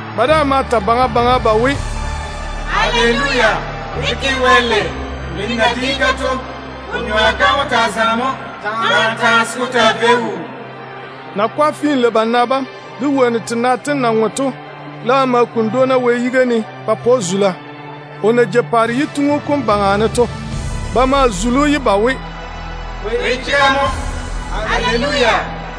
Ba daa ma ta baŋa baŋa ba we: “Aleluya! Mini na di-ka to, ko nyoa kam wó taa zaŋa mo taa, se ko taa vei wuu.” Nakwa finlei-bana bam, de wonnu tena tem na ŋwe to laam ma kuni dwoona Wɛ yiga ne ba pa‑o zula, o na jei paare yituŋu kom baŋa ne to. Ba ma zuli‑o ye ba we: “Ameena! Aleluya!”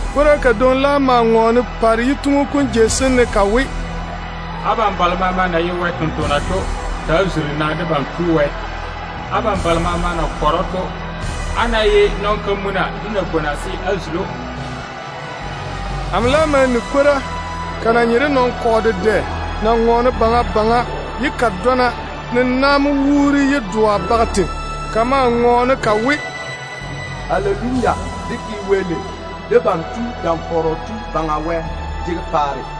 Kwora kadwoŋi laam ma ŋɔɔne paare yituŋu kom seeni ka we: “Abam balo maama na ye Wɛ tontoŋena to, ta‑á tei-na dé Tu Wɛ wom. Abam balo maama na kɔre‑o to, ko ná ye nɔn-kamuna de nabwona, á ta‑á zuli‑o.” Amo laam ma ni sɔɔ, ko na nye de nɔn-kɔgɔ dedɛ na ŋɔɔne baŋa baŋa, ye ko dɔna ne na mo wuuri ye doa baga tei. Ko maa ŋɔɔne ko we: “Aleluya! Debam Tu, Dam-fɔrɔ Tu Baŋa Wɛ mo di paare.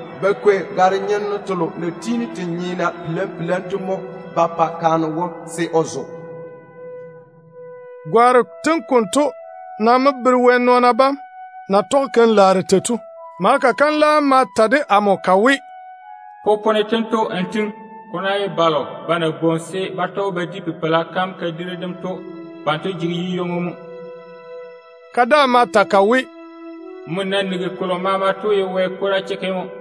Ba kwei gare-fefale selo na tiini se nyeena pele-pele to mo ba pa kaane wom se o zo.” Gwaaro tem konto nam mo bere Wɛ nɔɔna bam keim-laaro tem na ye tei to. Maleka kam laam ma ta de amo ka we, “Popone tento n tiŋi: Ko ná ye balo ba na bwoŋi se ba tɔge ba di Pipeila kam kadiri dem wodiu kom to, banto jege yu-ywoŋo mo.” Ka daa ma ta ka we, “Nmo na nigi kolo maama to ye Wɛ kwora chekke mo.”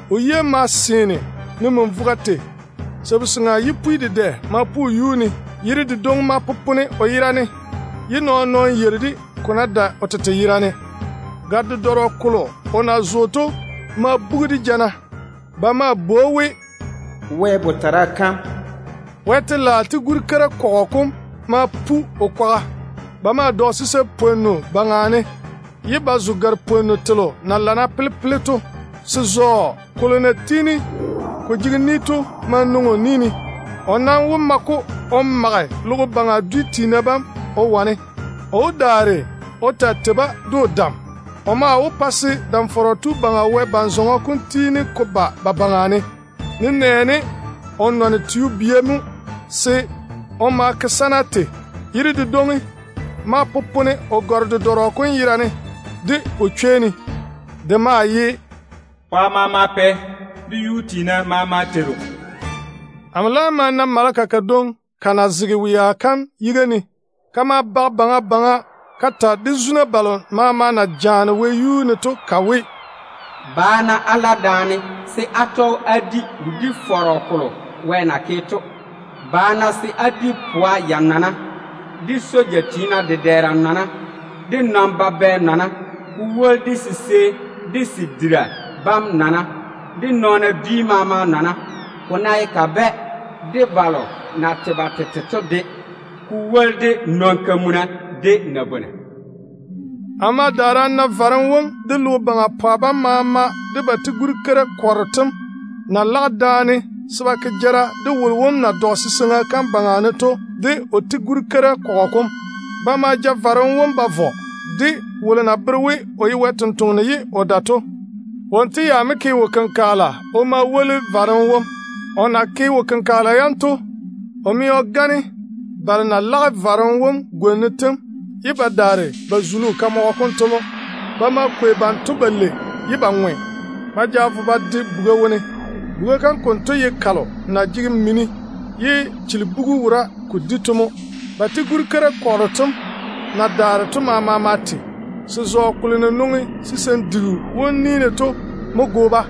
O yia maa seene ne min-vogo tei. Paare yipwi dedɛ ma pu o yuu ne. Yere dedwoŋi ma popone o yera ne, ye nɔɔn-nɔɔno yeiri-de, ko ná dae o tete yerane. Gare-dedɔrɔ kolo o na zo to ma bugi de jana. Ba maa bwoi‑o we, “Wɛ Botara kam”. Wɛ telaao jar-keira kɔgɔ kom ma pu o kwaga. Ba ma dɔge sisein-pwonnu baŋa ne, ye ba zo gare-fefale selo na ye napwonnu fase to. Se-zɔɔ kolo na tiini ko jege ni to maa nwoŋi o ni ne. O nam wó ma-ko o mage logo baŋa dwi tiina bam o de tega ne. O ta wó kwei luu-dedɔrɔ mo o ma wane-ba de o dam. O maa wó pa se Dam-fɔrɔ Tu Baŋa Wɛ ban-zɔŋɔ kom tiini ko ba ba baŋa, nenɛɛne o nɔne Vini tio-bia mo se ba nyoa bam taa nwoŋa tei. Yere dedwoŋi ma popone o gare-dedɔrɔ kom yera ne, de o chwei ne de we: “Pwa maama Pɛ, de yuu tiina maama Yuu-tu.” Amo laam ma na maleka kadwoŋi ka na zege wea kam tetare ne. Ka ma bage baŋa baŋa ka ta de zuna balo maama na jaane wɛyuu ne to ka we, “Ba-na á la daane se á tɔge á di wodi-fɔrɔ kolo Wɛ na ke to. Ba-na se á di pwa ya-nɔna, de jar-keira yiga tiina nɔna, de nɔn-babɛ nɔna, ko woli de sisei de se diina bam nɔna, de nɔɔna dwi maama nɔna, ko ná ye kabɛ de balo na tei ba tete to de, ko woli de nɔn-kamuna de nabwona.” Amo ma daare a na varem wom, de logo baŋa pwa bam maama, de ba jar-keira bam na lage daane se ba ke jara de wolo wom na dɔge siseiŋa kam baŋa ne to de o jar-keira kɔgɔ kom. Ba ma ja varem wom ba vɔ, de wolo na bere we o ye Wɛ sampwora ye o gane nɔɔna to. Wonto ya mo ke wo-kenkagela o ma woli varem wom. O na ke wo-kenkagela yam konto to, o mɛ o gane balo na lage varem wom gwona yam ye ba daare ba zuli o kamɔgɔ kom to mo. Ba ma kwei banto balei ŋweene, ba ja vo ba de buga wone. Buga kam kanto ye kalo na jege mini ye chilibugu wora ko di to mo. Ba jar-keira kɔgɔ kom na daare to maama ma te. Se-zɔɔ kolo na nwoŋi sisein-diru wom ni ne to mo go-ba.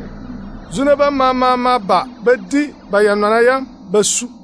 Zuna bam maama ma ba ba di ba ya-nɔna yam ba su.